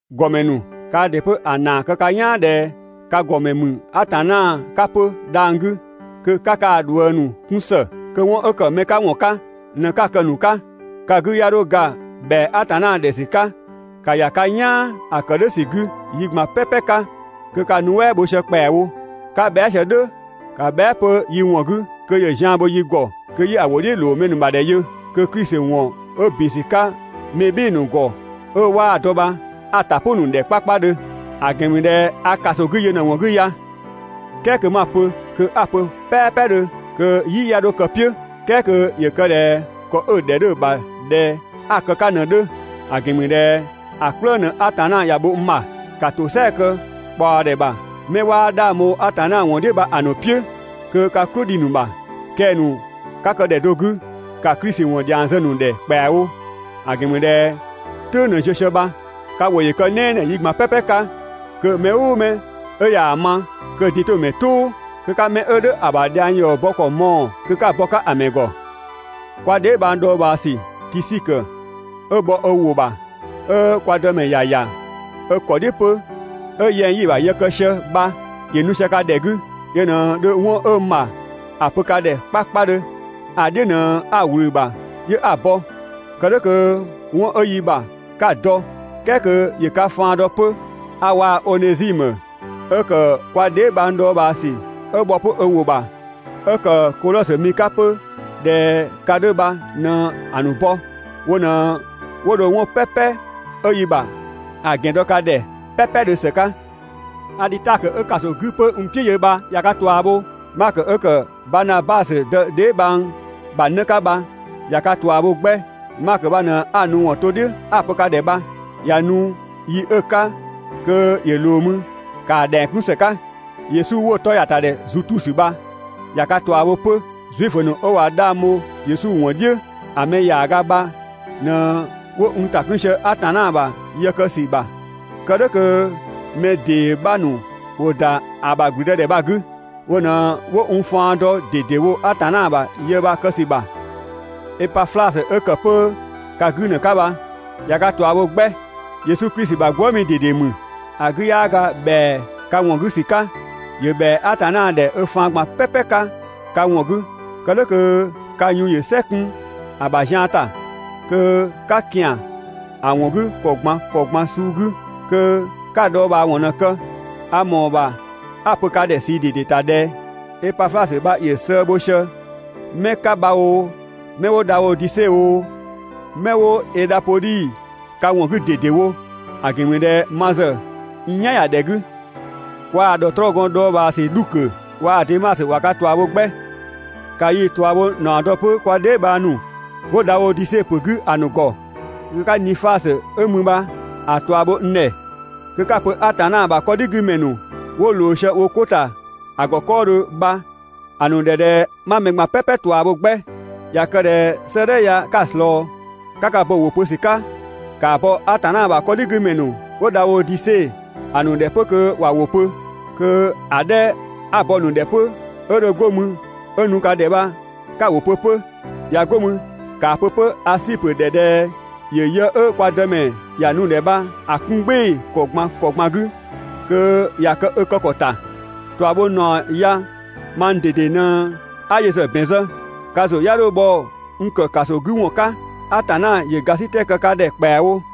‑Gɔmɛ ‑nu, kaa ‑dɩ 'pö ‑a ‑naa kë ka "yaan ꞊dhɛ ka ‑gɔmɛ ‑mü Atanna 'ka 'pö dhang‑ 'gü, kö 'ka kaa‑ ꞊dhuëngzë ‑nu 'kun ‑së, kö 'wɔn 'ö ‑kë mɛ 'ka 'wɔn 'ka ꞊në‑ 'ka‑ kë‑ ‑nu 'ka. Ka 'gü 'ya 'dho ga ‑bhɛa Atanna ‑dhɛ ‑sü 'ka, ‑ka ‑ya ka "yaan ‑a kë "dhʋ̈ ‑sü 'gü yi ꞊gban "pɛpɛ 'ka kö ka‑ nuɛ" bho sië ‑kpɛawo. 'Ka bhɛa" sië "dhʋ̈, ‑ka bhɛa" 'pö yi ‑wɔn 'gü kö ‑yö zian bho yi ‑gɔ kö 'yi‑ ‑wʋ "dhiʋ̈ ‑loo mɛ ‑nu ‑bha ‑dhɛ yö, kö Klisi ‑wɔn 'ö ‑bin ‑sü 'ka mɛ "bhɩɩ‑ ‑nu ‑gɔ 'ö 'waa‑ dɔ bha 'a‑ ‑ta "pʋ‑ ‑nu ‑dhɛ 'kpakpadhö, ‑a ‑gɛn ‑mü ꞊dhɛ a ‑kaso 'gü yö ꞊në‑ ‑wɔn 'gü ya, "kɛɛ kö 'ma‑ pö, kö 'a‑ pö "pɛɛpɛdhö, kö "yi 'ya 'dho kë‑ "piʋ̈, "kɛɛ kö ‑yö kë ꞊dhɛ ‑kɔ 'ö‑ ‑dhɛ 'dhö‑ ‑bha ꞊dhɛ 'a‑ kë‑ 'ka ꞊në‑ 'dhö, ‑a ‑gɛn ‑mü ꞊dhɛ ‑a "kplëng ꞊në Atanna ‑ya bho n ‑bha. ‑Ka ‑tosɛa kë ꞊kpaɔdhɛ ‑bha 'mɛ 'waa 'dhang bho Yesu ‑wɔn "dhiʋ̈‑ ‑nu "piʋ̈ (kö ka "klʋ‑ dhi‑ ‑nu ‑bha), kɛng‑ ‑nu 'ka kë ‑dhɛ do 'gü, ‑ka Klisi ‑wɔn ‑dhiang zë‑ ‑nu ‑dhɛ ‑kpɛawo, ‑a ‑gɛn ‑mü ꞊dhɛ "tʋ̈ng ꞊në ziö sië bha. Ka ‑wʋ ‑yö kë "nɛɛnɛɛ yi ꞊gban "pɛpɛ 'ka kö mɛ "ʋʋ mɛ 'ö ꞊yaa‑ ma, kö‑ din‑ 'to‑ ‑mɛ "tʋʋ, kö 'ka mɛ 'ö "dhʋ̈ ‑a ‑bha dhiang ‑yɔ bɔ ‑kɔ mɔɔ‑ kö 'ka‑ bɔ‑ 'ka‑ ‑mɛ ‑gɔ. Kwa dheebhang dhɔɔbhaa ‑sü Tisikö 'ö bhɔ ö ‑wʋ ‑bha, 'ö kwa Dëmɛ ‑ya ‑ya ö ‑kɔ "dhiʋ̈ 'pö, 'ö yɛng‑ 'yi‑ ‑bha yë kë sië bha ‑yö nu sië ka ‑dhɛ 'gü, yö ꞊në dho 'wɔn 'ö n ‑bha ‑a pö ka ‑dhɛ 'kpakpadhö. ‑A "dhiʋ̈ ꞊në 'a‑ ꞊wlü‑ ‑bha 'yö 'a‑ bɔ. Kë "dhʋ̈ kö 'wɔn 'ö yi ‑bha 'ka‑ dɔ, "kɛɛ kö ‑yö ka faan dɔ 'pö. A waa‑ Onezimö 'ö kë kwa dheebhang dhɔɔbhaasü 'ö bhɔ 'pö ö ‑wʋ ‑bha, 'ö ‑kë Kodhɔsö mi 'ka 'pö ꞊dhɛ ka 'dhö bha ꞊në‑ ‑nu bɔ. Wo ꞊në 'wo dho 'wɔn "pɛpɛ 'ö yi ‑bha ‑a ‑gɛn dɔ ka ‑dhɛ "pɛpɛdhö ‑së 'ka. Adhitakö 'ö ‑kaso 'gü 'pö n "piʋ̈ yö bha ꞊ya ka ꞊tua bho, Makö 'ö ‑kë Banabasö dë dheebhang bha 'në 'ka bha, ꞊ya ka ꞊tua bho 'gbɛ. Makö bha ꞊në 'a‑ nu ‑wɔn to "dhiʋ̈ 'a‑ pö ka ‑dhɛ bha, ꞊ya nu yi 'ö‑ 'ka kö ‑yö ꞊loo mü, ‑kaa ‑dhɛng 'kun ‑së 'ka. Yesu 'wo‑ 'tɔ ‑ya ‑ta ‑dhɛ Zutusö bha, ꞊ya ka ꞊tua bho 'pö. Zuifö ‑nu 'ö ꞊wa 'dhang bho Yesu ‑wɔn "dhiʋ̈ ‑a mɛ ‑yaaga bha ꞊në 'wo n ‑ta 'kun sië Atanna ‑bha yë kë ‑sü ‑bha (kë "dhʋ̈ kö mɛ ‑dee 'bha ‑nu ‑wo ‑da ‑a ‑bha ‑gblüdëdhɛ bha‑ 'gü). Wo ꞊në 'wo n faan dɔ ꞊dedewo Atanna ‑bha yë bha‑ kë ‑sü ‑bha. Epaflasö 'ö ‑kë 'pö ka 'gü 'në 'ka bha, ꞊ya ka ꞊tua bho 'gbɛ. Yesu Klisi ‑bha gwëëmi ꞊dede ‑mü. ‑A 'gü 'yaa ga ‑bhɛa ka ‑wɔn 'gü ‑sü 'ka, ‑yö ‑bhɛa Atanna ‑dhɛ ö faan ꞊gban "pɛpɛ 'ka ka ‑wɔn 'gü, kë "dhʋ̈ kö ka yun ‑yö "sɛ 'kun ‑a ‑bha zian ‑ta, kö 'ka ‑kian ‑a ‑wɔn 'gü ‑kɔ ꞊gban ‑kɔ ꞊gban suu 'gü, kö 'ka‑ dhɔɔbhaawɔn ꞊në‑ kë. A ‑mɔɔ ‑bha 'a‑ pö ka ‑dhɛ ꞊sii ꞊dede ‑ta ꞊dhɛ: Epaflasö bha ‑yö sëë bho sië 'mɛ 'ka bha oo, 'mɛ 'wo Dhaodise oo, 'mɛ 'wo Edhapodhi ka ‑wɔn 'gü ꞊dedewo, ‑a ‑gɛn ‑mü ꞊dhɛ ma ‑zë n "yan ‑ya ‑dhɛ 'gü. Kwaa‑ ‑dhɔtrɔɔgɔn dhɔɔbhaasü Dhukö waa‑ Demasö ꞊wa ka ꞊tua bho 'gbɛ. ‑Ka yii‑ ꞊tuabhonaɔ dɔ 'pö kwa dheebhang ‑nu 'wo Dhaodise ‑pö 'gü ‑a ‑nu ‑gɔ. Kö 'ka Nifasö 'ö mü bha‑ ꞊tua bho n ‑dhɛ, kö 'ka‑ pö Atanna ‑bha 'kɔdhigümɛ ‑nu 'wo ꞊loo sië wo 'ko ‑ta ‑a ‑gɔ 'kɔɔdhö bha‑ ‑nu ‑dhɛ 'ma‑ ‑nu ꞊gban "pɛpɛ ꞊tua bho 'gbɛ. ꞊Ya kë ꞊dhɛ 'sëëdhɛ ya 'ka‑ ꞊slɔɔ, 'ka ka bo‑ ‑wʋ pö ‑sü 'ka, ‑kaa bɔ Atanna ‑bha 'kɔdhigümɛ ‑nu 'wo Dhaodise ‑nu ‑dhɛ 'pö kö ‑wa ‑wʋ pö, kö‑ 'dhɛ 'a‑ bɔ‑ ‑nu ‑dhɛ 'pö 'ö dho 'go mü 'ö nu ka ‑dhɛ bha 'ka‑ ‑wʋ pö 'pö. ꞊Ya 'go mü ‑kaa pö 'pö Asipö ‑dhɛ ꞊dhɛ ‑yö yë 'ö kwa Dëmɛ ‑ya nu‑ ‑dhɛ bha‑ 'kun "gbɩɩ‑ ‑kɔ ꞊gban ‑kɔ ꞊gban 'gü kö ‑ya kë ö kë ‑kɔ ‑ta. ꞊Tuabhonaɔ ya mang ꞊dede ꞊në 'a yö ‑zë ‑bɛn zë. Ka ‑zʋ 'ya 'dho bhɔ n ‑kë ‑kaso 'gü ‑wɔn 'ka. Atanna ‑yö ‑gasitɛ kë ka ‑dhɛ ‑kpɛawo.